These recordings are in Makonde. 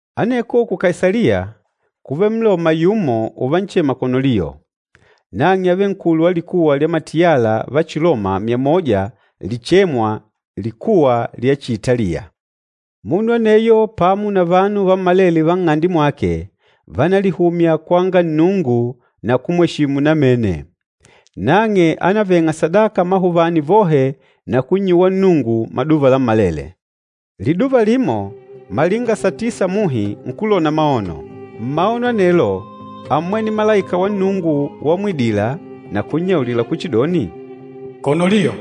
Aneko ku Kaisaliya kúvele Mloma yumo uvanchema Konoliyo. Nang'e ávele nkulu wa likuwa lya matiyala va Chiloma myamoja lichichêmwa, “Likuwa lya Chiitaliya.” Munu aneyo pamo na vanu vammalele va nng'ande mwake vánalihumya kwanga Nnungu na kumweshimu namene. Nang'e ánaveng'a sadaka amahuvani vohe na kunnyuwa Nnungu maduva lammalele. Liduva limo, malinga satisa muhi nkulona maono. Mmaono anelo ámmwene malaika wa Nnungu wamwidila na kunnyaulila kuchidoni, “Konoliyo!”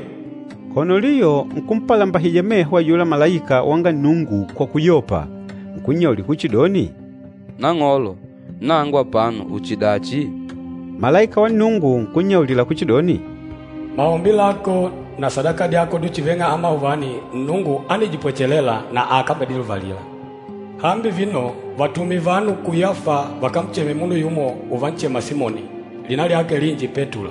Konoliyo nkumpalambahija meho ayula malaika wanga Nnungu kwa kuyopa, nkunnyaulila kuchidoni, “Nang'olo, nangu apano uchidachi?” Malaika wa Nnungu nkunnyaulila kuchidoni, “Maombi lako na sadaka dyako dyuchiveng'a amahuvani Nnungu ánidipwechelela na akambediluvalila. Hambi vino, vatume vanu ku Yafa vakancheme munu yumo uvanchema Simoni, lina lyake linji Petulo.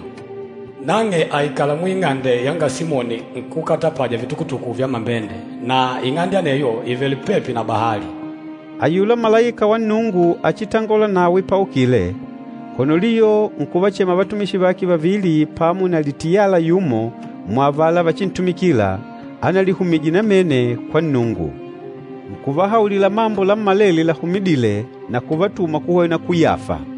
Nang'e àikala muing'ande yanga Simoni nkúkatapaja vitukutuku vya mambende, na ing'ande aneyo ìvele pepi na bahali.” Ayula malaika wa Nnungu achitangôla nawe paukile, Konoliyo nkuvachema vatumishi vake vavili pamo na litiyala yumo muavala vachintumikila, analihumije namene kwa Nnungu. Nkuvahaulila mambo lammalele lahumidîle na kuvatuma kuhwena ku Yafa.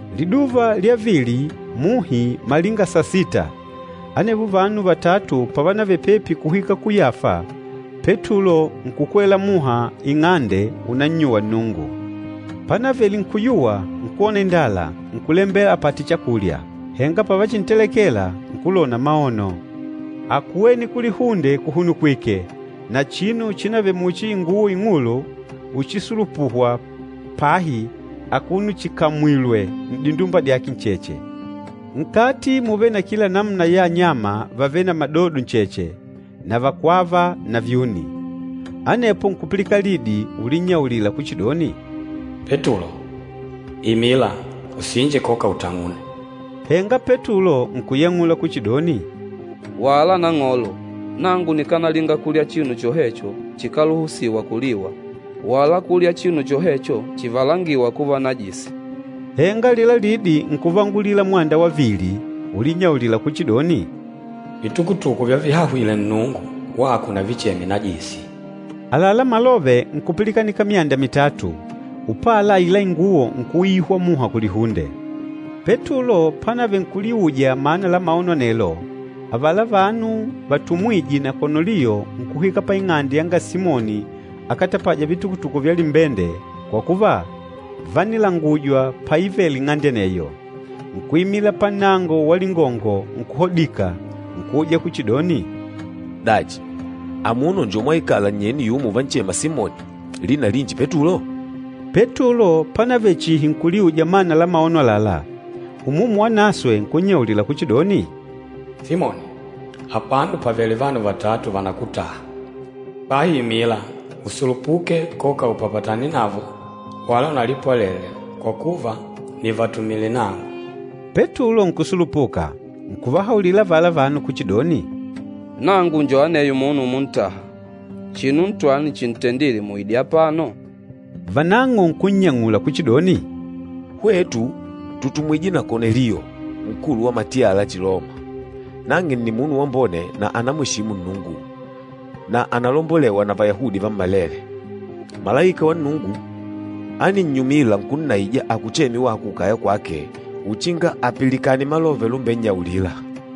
Liduva lya vili muhi malinga sasita, anevo vanu vatatu pavanavele pepi kuhwika ku Yafa, Petulo nkukwela muha ing'ande unannyuwa Nnungu. Panavele nkuyuwa nkwona indala, nkulembela apate chakulya. Henga pavachintelekela, nkulona maono. Ákuwene kulihunde kuhunukwike na chinu chinavele muchi inguwo ing'ulu uchisulupuhwa pahi akuno chikamwìlwè n'dindumba dyake ncheche. Nkati múvele na kila namuna ya anyama vavêle na madodo ncheche, na vakwava na vyuni. Anepo nkupilikana lidi ulinnyaulila kuchidoni, “Petulo, imila, usinje koka utang'une.” Henga Petulo nkuyang'ula kuchidoni, “Wala, Nang'olo! Nangu nikanalinga kulya chinu chohecho chikáluhusiwa kuliwa, wala kulya chinu chohecho chivalangîwa kuva najisi.” Henga alila lidi nkuvangulila mwanda va vili, ulinnyaulila kuchidoni, “Vitukutuku vyavihahwile Nnungu, wako unavicheme najisi.” Àlalá malove nkupilikanika myanda mitatu, upala aila inguwo nkuuyihwa muha kulihunde. Petulo panavele nkuliuja mana la maono anelo, avala vanu vatumwîje na Konoliyo nkuhwika paing'ande yanga Simoni akatapâja vitukutuku vya limbende kwa kuva, vánilangujwa paivele ing'ande aneyo. Nkuimila pannango wa lingongo nkuhodika, nkuuja kuchidoni, “Dachi, amuno njo mwaikala nnyeni yumo uvanchema Simoni, lina linji Petulo?” Petulo panavele chihi nkuliuja mana la maono àlalá, Umumu Wanaswe nkunnyaulila kuchidoni, “Simoni, apano pàvele vanu vatatu vànakutaha. Bahi imila, usulupuke koka upapatane navo wala unalipwalele kwa kuva nìvatumile nangu.” Petulo nkusulupuka, nkuvahaulila avala vanu kuchidoni, “Nangu njo aneyo munu umuntaha. Chinu ntwani chintendîle muide apano?” Vanang'o nkunnyang'ula kuchidoni, “Hwetu tùtumwije na Konoliyo, nkulu wa matiyala la Chiloma. Nang'e nni munu wambone na ànamweshimu Nnungu, na ànalombolewa na Vayahudi vammalele. Malaika wa Nnungu áninnyumila nkunnaija akucheme wako kukaya kwake uchinga apilikane malove lumbennyaulila.”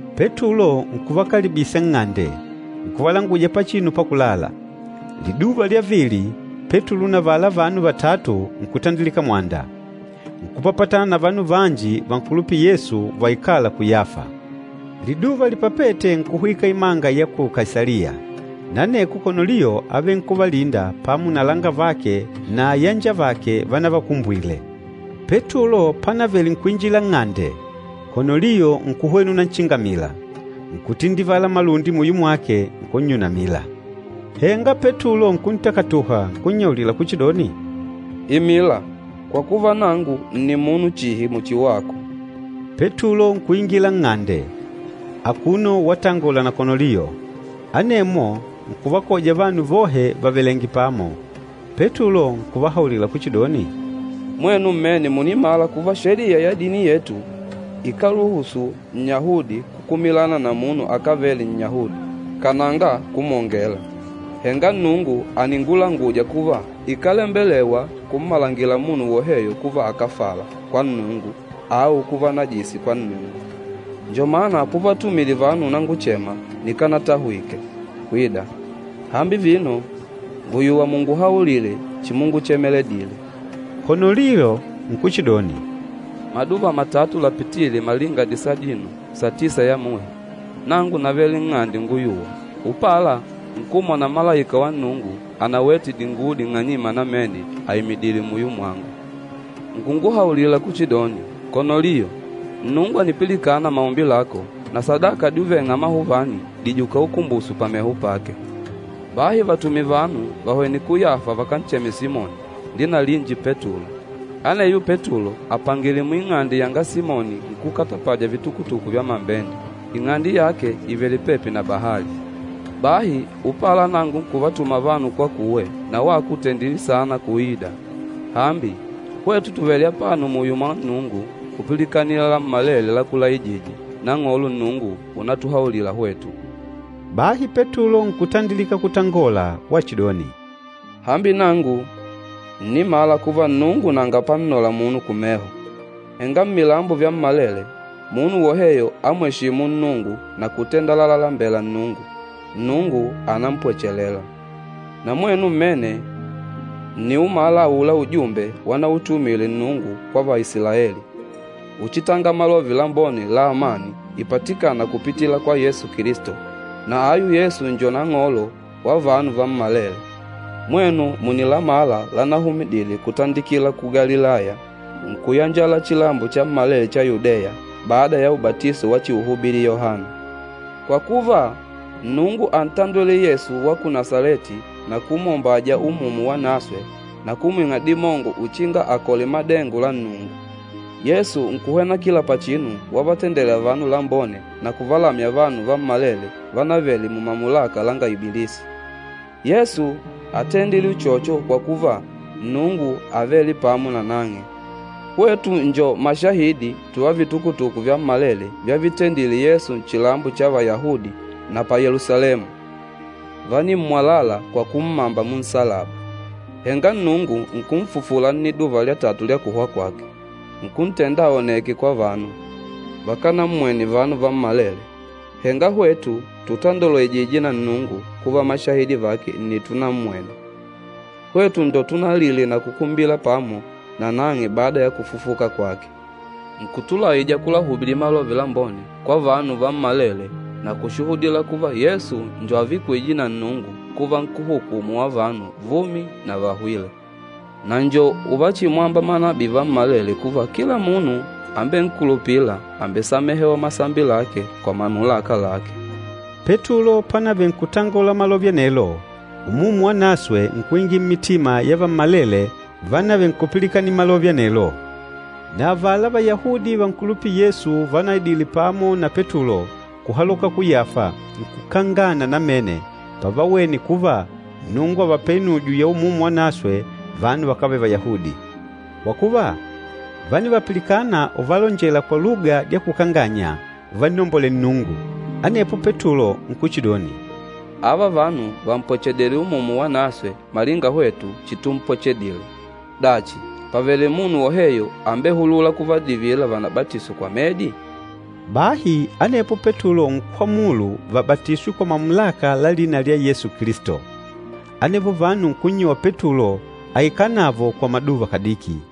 Petulo nkuvakalibisa nng'ande, nkuvalanguja pachinu pakulala. Liduva lya vili, Petulo na avala vanu vatatu nkutandilika mwanda. Nkupapatana na vanu vanji vankulupîla Yesu vaikâla ku Yafa. Liduva lipapête nkuhwika imanga ya ku Kaisaliya. Na aneko Konoliyo ávele nkuvalinda pamo na alangavake na ayanjavake vanavakumbwile. Petulo panavele nkuinjila nng'ande, Konoliyo nkuhwena unanchingamila, nkutindivala malundi muyo mwake, nkunnyunamila. Henga Petulo nkuntakatuha nkunnyaulila kuchidoni, “Imila, kwa kuva, nangu nni munu chihi muchi wako.” Petulo nkuingila nng'ande akuno watangola na Konoliyo, anemwo nkuvakoja vanu vohe vavelèngè pamo. Petulo nkuvahaulila kuchidoni, “Mwenu mmene mùnimala kuva Sheliya ya dini yetu ikáluhusu Nnyahudi kukumilana na munu akávele Nnyahudi, kananga kumwongela. Henga Nnungu àningulanguja kuva ikálembelewa kummalangila munu woheyo kuva akáfala kwa Nnungu au kuva najisi kwa Nnungu. Njo mana puvatumile vanu unanguchema nikánatahwike kwida. Hambi vino, ngùyuwa munguhaulile chimunguchemedile.” Konoliyo nkuchidoni, “Maduva matatu lapitîle malinga disadino, satisa ya muhi, nangu navele nng'ande unguyuwa. Upala, nkumwona malaika wa Nnungu anawete dinguwo ding'anyima namene aimidìlè muyo mwangu. Nkunguhaulila kuchidoni, ‘Konoliyo, Nnungu ànipilikana maombi lako na sadaka dyuveng'a amahuvani dìjuka ukumbuso pameho pake. Bahi vatume vanu vahwene ku Yafa vakancheme Simoni, lina linji Petulo. Aneyo Petulo àpangile muing'ande yanga Simoni nkúkatapaja vitukutuku vya mambende. Ing'ande yake ìvele pepi na bahali.’ Bahi upala nangu nkuvatuma vanu kwakuwe na wako ùtendile saana kuida. Hambi, hwetu tùvele apano muyo mwa Nnungu kupilikanila lammalele lakulaijîje Nang'olo Nnungu unatuhaulila hwetu.” Bahi Petulo nkutandilika kutangola wachidoni, “Hambi nangu ǹnimala kuva Nnungu nanga pannola munu kumeho. Henga mmilambo vyammalele, munu woheyo amweshîmu Nnungu na kutenda lalalembela Nnungu, Nnungu ànampwechelela. Na mwenu mmene ǹniumala aula ujumbe wanautumile Nnungu kwa Vaisilaeli, uchitanga Malove Lambone la amani ipatikâna kupitila kwa Yesu Kilisto. Na ayu Yesu njo Nang'olo wa vanu vammalele. Mwenu mùnilamala lanahumidile kutandikila ku Galilaya nkuyanjala chilambo chammalele cha Yudeya bada ya ubatiso wachiuhubili Yohana. Kwa kuva, Nnungu ántandwele Yesu wa ku Nasaleti na kumwombaja Umumu Wanaswe na kumwing'a dimongo uchinga akole madengo la Nnungu. Yesu nkuhwena kila pachinu wavatendela vanu lambone na kuvalamya vanu vammalele vanavele mumamulaka langa Ibilisi. Yesu átendile uchocho kwa kuva, Nnungu ávele pamo nanang'e. Hwetu njo mashahidi tuva vitukutuku vyammalele vyavitendile Yesu nchilambo cha Vayahudi na pa Yelusalemu. Vánimmwalala kwa kummamba munsalaba. Henga Nnungu nkunfufula nniduva lya tatu lya kuhwa kwake, nkuntenda aoneke kwa vanu. Vakanammwene vanu vammalele, henga hwetu tutandolwejîje na Nnungu kuva mashahidi vake nni tunammwene. Hwetu njo tunalile na kukumbila pamo nanang'e bada ya kufufuka kwake. Nkutulaija kulahubili Malove Lambone kwa vanu vammalele na kushuhudila kuva Yesu njo avikwîje na Nnungu kuva Nkúhukumu wa vanu vumi na vahwîle. Na njo uvachimwamba manabii vammalele kuva kila munu ambenkulupîla àmbesamehewa masambi lake kwa mamulaka lake.” Petulo panavele nkutangola malove anelo, Umumu Wanaswe nkuingila mmitima ya vammalele vanavele nkupilikanila malove anelo. Na avala Vayahudi vankulupîla Yesu vanaidile pamo na Petulo kuhaloka ku Yafa nkukangana namene pavawene kuva Nnungu àvapele inujo ya Umumu Wanaswe vanu vakávele Vayahudi. Kwa kuva, vánivapilikana uvalonjela kwa luga dya kukanganya uvannombolela Nnungu. Anepo Petulo nkuchidoni, “Ava vanu vàmpwechedile Umumu Wanaswe malinga hwetu chitumpwechedile. Dachi, pàvele munu woheyo ambehulûla kuvadivila vanabatiswe kwa medi?” Bahi anepo Petulo nkwamulu vabatiswe kwa mamulaka la lina lya Yesu Kilisto. Anevo vanu nkunnyuwa Petulo aikale navo kwa maduva kadiki.